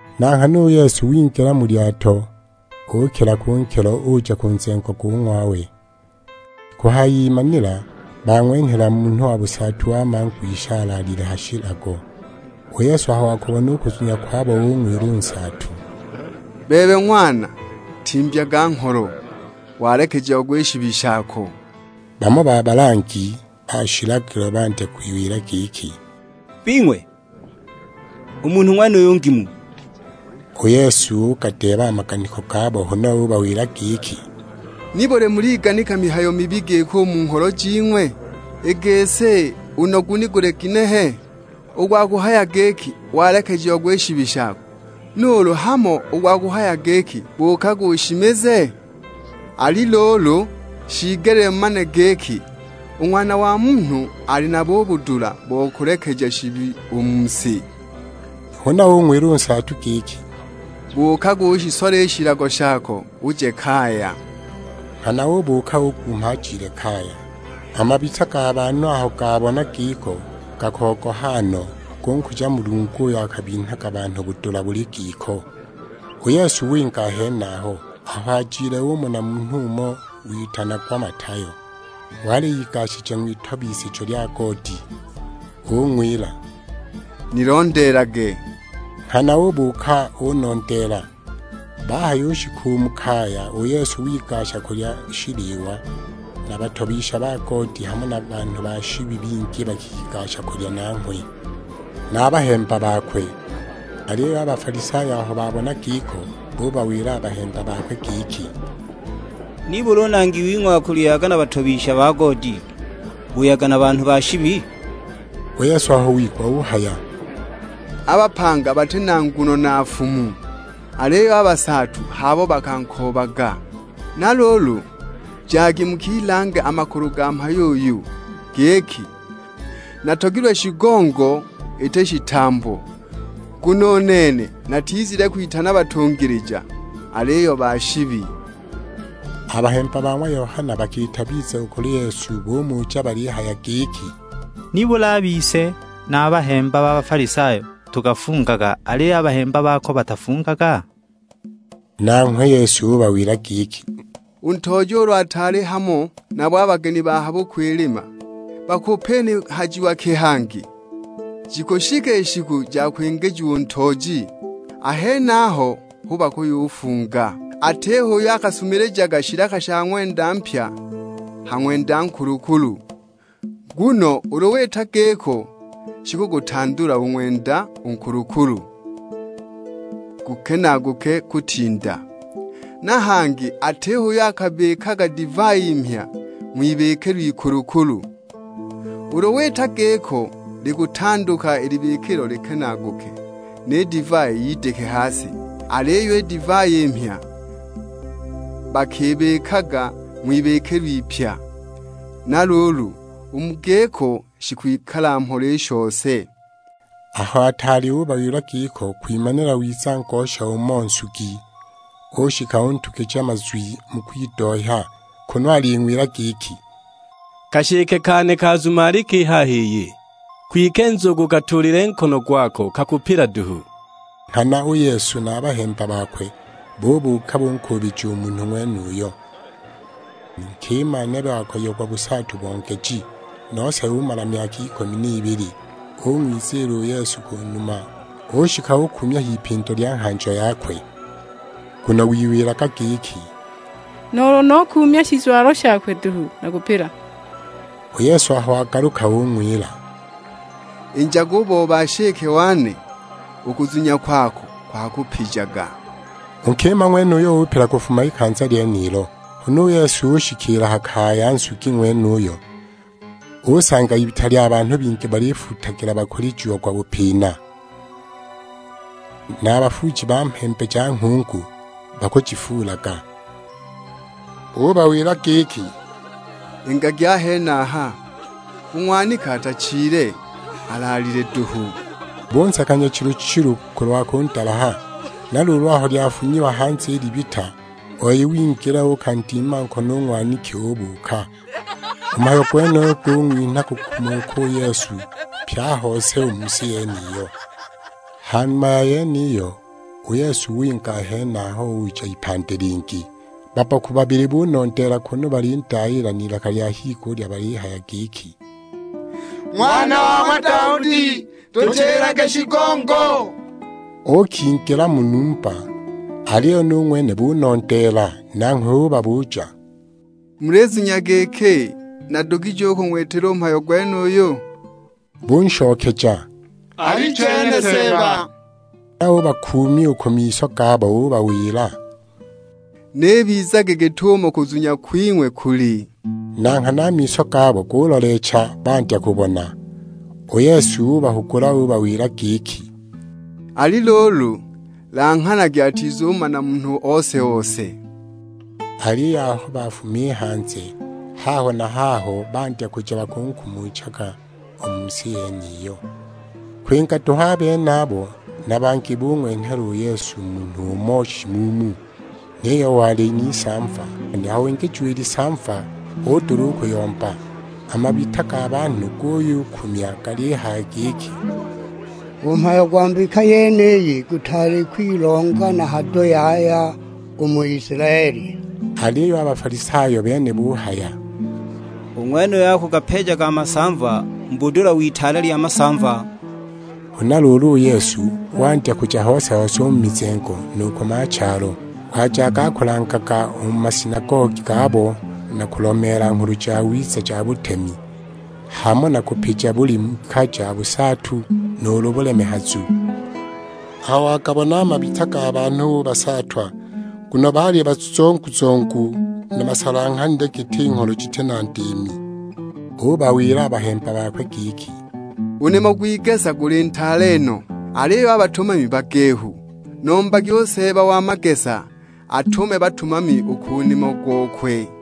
Na nghana u Yesu wingila mu lyato, ukila ku nkilo uja ku nzengo go ng'wawe. Kuhayimanila bang'wenhela munhu wa busaatu wa mangwisha alaalile ha shilago. U Yesu aho wakubona u kuzunya kwabo ung'wila u nsaatu, "Bebe ng'wana, timbyaga ngholo, walekejiagwa i shibi shako." Bamo ba balangi ba shilagilo bandya kwiwila giki, "Bing'we, u munhu ng'wenuyu ngimu!" U Yesu ugadeeba a maganiko gabo, huna ubawila giki, "Nibuli muliganika mihayo mibi giko u mu ngholo jing'we? I gisi, u nogu ni guli ginehe? U gwa kuhaya giki, 'Walekejiagwa i shibi shako,' nuulu hamo u gwa kuhaya giki, 'Buukaga ushimize?' Ali luulu, shiigelile mumane giki u Ng'wana wa Munhu ali nabo u budula bo kulekeja shibi u mu si." Huna ung'wila u nsaatu giki, "Buukaga ushisole i shilago shako uje kaya." Nghana ubuuka, ugumha ajile kaya! A mabita ga banhu aho gabona giko gakogoha no, gunkuja Mulungu uyo akabinhaga banhu budula buli giko! U Yesu winga a henaho, aho ajile umona munhu umo, witanagwa Matayo; wali igashije ng'witobisijo lya goodi, ung'wila, "Nilondeelage." Nghana ubuuka unondeela. Bahayushika mu kaya, u Yesu wigasha kulya shiliwa. Na batobisha ba goodi hamo na banhu ba shibi bingi bakigasha kulya nanghwe, na a bahemba bakwe. Aliyo a Bafalisayo aho babona giko, bubawila a bahemba bakwe giki, "Nibuli u Nangi wing'we akulyaga na batobisha ba goodi, buyaga na banhu ba shibi?" U Yesu aho wigwa uhaya, "A bapanga bati na nguno na nfumu, aliyo a basaatu h'abo bakankoobaga. Na luulu, jagi mukilange a makulu ga mhayo uyu, giki: 'Natogilwe shigongo, iti shitambo;' nguno u nene natizile kwitana batungilija, aliyo ba shibi!" A bahemba ba ng'wa Yohana bakiita biza u kuli Yesu, bumuja balihaya giki, "Nibuli a bise na a bahemba ba Bafalisayo tukafungaga, aliyo a bahemba bako batafungaga?" Nanghwe u Yesu ubawila giki, "U ntooji ulu ataali hamo nabo a bageni ba ha bukwilima, bakupinihajiwa ki hangi? Jikushika i shiku ja kwingijiwa u ntooji; a henaho hu bakuyufunga. Atiho uyo akasumilijaga shilaka sha ng'wenda mpya ha ng'wenda nkulukulu; nguno ulu wita giko shikugutandula u ng'wenda u nkulukulu, gukenaaguke kutinda. Na hangi atiho uyo akabikaga divai mhya ng'wibikilo ikulukulu, ulu wita giko likutanduka i libikilo likenaaguke, ni divai yidike ha si! Aliyo i divai i mhya bakibikaga ng'wibikilo ipya; na luulu, u mu giko shikwikala mhola i shose." Aho ataali ubawila giko, kwimanila wiza ngosha umo nsugi; ushika untugija mazwi mu kwidohya, kunu aling'wila giki, "Kashike kane kazumalika i haha iyi, kwike nzugu ukatuulile nkono gwako kakupila duhu!" Nghana u Yesu na a bahemba bakwe bubuuka bunkuubija u munhu ng'wenuyo. Nkima nebe wakoyiagwa busaatu bo ngeji, nose umala myaka ikumi n'ibili; ung'wiziila u Yesu ku numa, ushika ukuumya h'ipindo lya nghanjo yakwe. Nguno wiwilaga giki, "Nuulu nukuumya shizwalo shakwe duhu nakupila!" U Yesu aho wagaluka ung'wila, "Injaga u booba nshike wane, u kuzunya kwako kwakupijaga." U nkima ng'wenuyo upila kufuma ikanza lyenilo. Huna u Yesu ushikiila a ha kaya ya nsugi ng'wenuyo, usanga ibita lya banhu bingi balifuutagila bakulijiagwa bupina; na bafuuji ba mhembe ja nghungu bakujifuulaga. Ubawila giki, "Ingagi a henaha, u ng'waniki atachile, alaalile duhu." Bunseka nyachilu-chilu kulwa kundalaha! Na luulu aho lyafunyiwa hanze i libita, u wei wingila uukandima nkono u ng'waniki, ubuuka! U mhayo gwenuyo gung'winha kukumuka u Yesu, pye a hose u mu si yeniyo. Ha numa ya yeniyo, u Yesu winga a henaho uja ipandi lingi. Babboku babili bunondeela, kunu balindayiila n'ilaka lya higulya balihaya giki, "Ng'wana wa ng'wa Daudi, tuchilage shigongo!" Uukingila mu numba, aliyo nu ng'wene bunondeela; nanghwe ubabuja, "Mulizunya giki nadugije kung'witila u mhayo gwenuyu?" Bunshokeja, "Alichene Seeba!" Huna ubakuumya u ku miso gabo; ubawila, "N'ibizage git'umo kuzunya kwing'we kuli." Na nghana a miso gabo guloleecha, bandya kubona. U Yesu ubahugula ubawila giki, "Ali luulu, langhanagi atizumana munhu ose-ose." Aliyo aho bafuma i hanze, haho na haho bandya kuja bakunkumuchaga u mu si yeniyo. Kwinga duhu a benabo, na bangi bung'wenhela u Yesu munhu umo shimuumu, niyo wali n'isamva! Aho wingijiwa i lisamva udula u kuyomba. A mabita ga banhu guyukumya galihaya giki, "U mhayo gwa mbika yeniyi gutaali kwilonga na hado yaya u mu Isilaeli!" Aliyo a Bafalisayo a bene buyuhaya, "U ng'wenuyu akugapeejaga a masamva mu budula w'itaale lya masamva!" Huna luulu u Yesu wandya kuja hose-hose u mu mizengo nu ku machalo. Wajaga akulangaga u mu masinagogi gabo na kulomeela Nghulu Jawiza ja butemi, hamo na kupija buli mbika ja busaatu nuulu bulemehazu. Aho wagabona a mabita ga banhu ubasaatwa, nguno baali bazongu-zongu, na basalanghanile giti ngholo jiti na ndiimi! Ubawila a bahemba bakwe giki, "U nimo gw'igesa guli ntaale no, aliyo a batumami bagehu. Nombagi u Seeba wa magesa atume batumami u ku nimo gokwe."